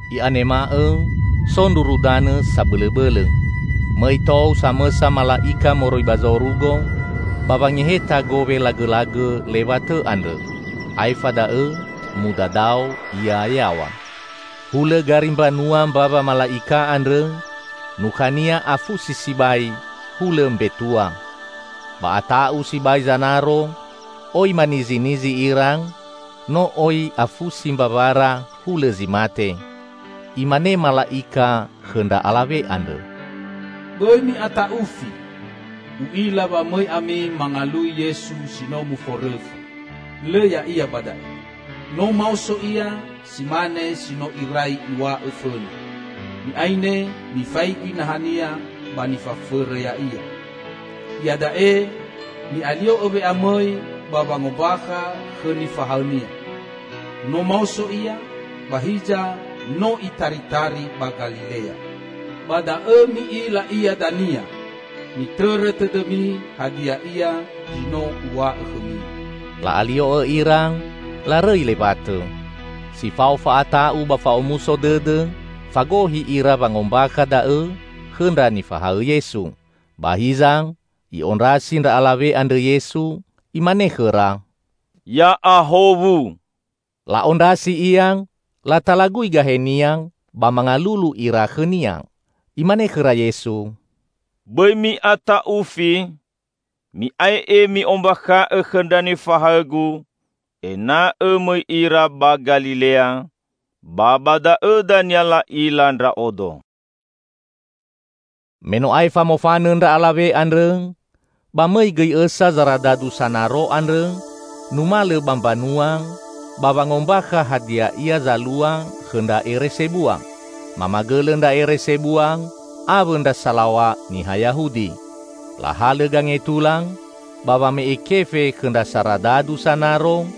I'anema'õ so ndruru danõ sabõlõbõlõ. Mõi tou samõsa mala'ika moroi ba zorugo ba wangeheta gowe lagõlagõ lewatõ andrõ, aefa da'õ mudadao ia yaw̃a. Hulõ gari mbanua mbawa mala'ika andrõ, nukhania afusi sibai, hulõ mbetua. Ba ata'u sibai zanaro, oi manizinizi ira, no oi afusi mbawara hulõ zi mate. Imane mala'ika khõ ndra alawe andrõ, "Bõi mi'ata'ufi! U'ila wa mõi ami mangalui Yesu si no muforõfa. Lõ Ya'ia ba da'e. No maoso Ia si mane si no irai Iw̃a'õ fõna. Mi'aine, mifaigi naha-Nia ba nifafõrõ Ya'ia. Iada'e mi'alio'õ we'amõi ba wangombakha khõ nifahaõ-Nia, 'No maoso Ia, ba hiza no Itaritari ba Galilea. Ba da'õ mi'ila Ia dania!' Mitõrõ tõdõmi hadia ia zi no uw̃a'õ khõmi." La'alio'õ ira larõi lewatõ. Si fao fa'ata'u ba fa'omuso dõdõ, fagohi ira wangombakha da'õ khõ ndra nifahaõ Yesu. Ba hiza, I'ondrasi ndra alawe andrõ Yesu, Imane khõra, "Ya'ahowu!" La'ondrasi Ia, latalagui gahe-Nia, ba mangalulu ira khõ-Nia! Imane khõra Yesu, "Bõi mi'ata'ufi, mi'ae'e mi'ombakha'õ khõ ndra nifahaõ-Gu ena'õ mõi ira ba Galilea; ba ba da'õ dania la'ila Ndra'odo." Me no aefa mofanõ ndra alawe andrõ, ba mõi gõi õsa zaradadu sanaro andrõ numalõ ba mbanua ba wangombakha hadia ia zalua khõ ndra ere sebua. Mamagõlõ ndra ere sebua awõ ndra salaw̃a niha Yahudi. Lahalõ gangetula ba wame'e kefe khõ ndra saradadu sanaro,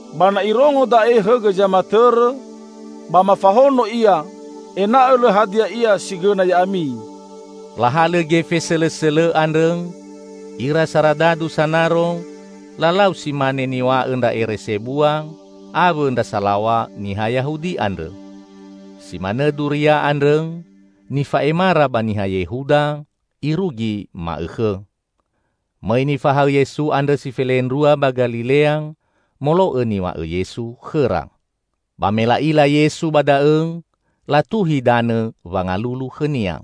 Ba na irongo da'e hõgõ zamatõrõ ba mafahono ia ena'õ lõ hadia ia si gõna ya'ami." Lahalõ gefe sõlõsõlõ andrõ ira saradadu sanaro, lalau si mane niw̃a'õ ndra ere sebua awõ ndra salaw̃a niha Yahudi andrõ. Si manõ duria andrõ nifa'emara ba niha Yehuda irugi ma'õkhõ. Mõi nifahaõ Yesu andrõ si felendrua ba Galilea molo'õ niw̃a'õ Yesu khõra. Ba me la'ila Yesu ba da'õ, latuhi danõ wangalulu khõ-Nia.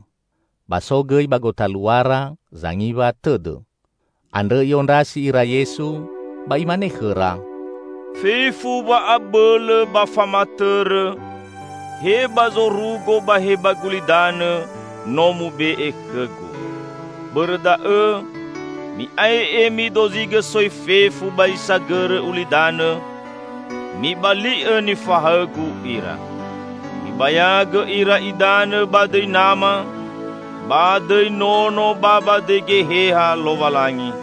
Ba so gõi ba gotaluara zangiwa tõdõ. Andrõ i'ondrasi ira Yesu ba Imane khõra, "Fefu wa'abõlõ ba famatõrõ, he ba zorugo ba he ba gulidanõ no mube'e khõ-Gu. Bõrõ da'õ, mi'ae'e midozigõ soi fefu ba zi sagõrõ ulidanõ, mibali'õ nifahaõ-Gu ira. Mibayagõ ira idanõ ba dõi Nama, ba dõi Nono ba ba dõi Geheha Lowalangi.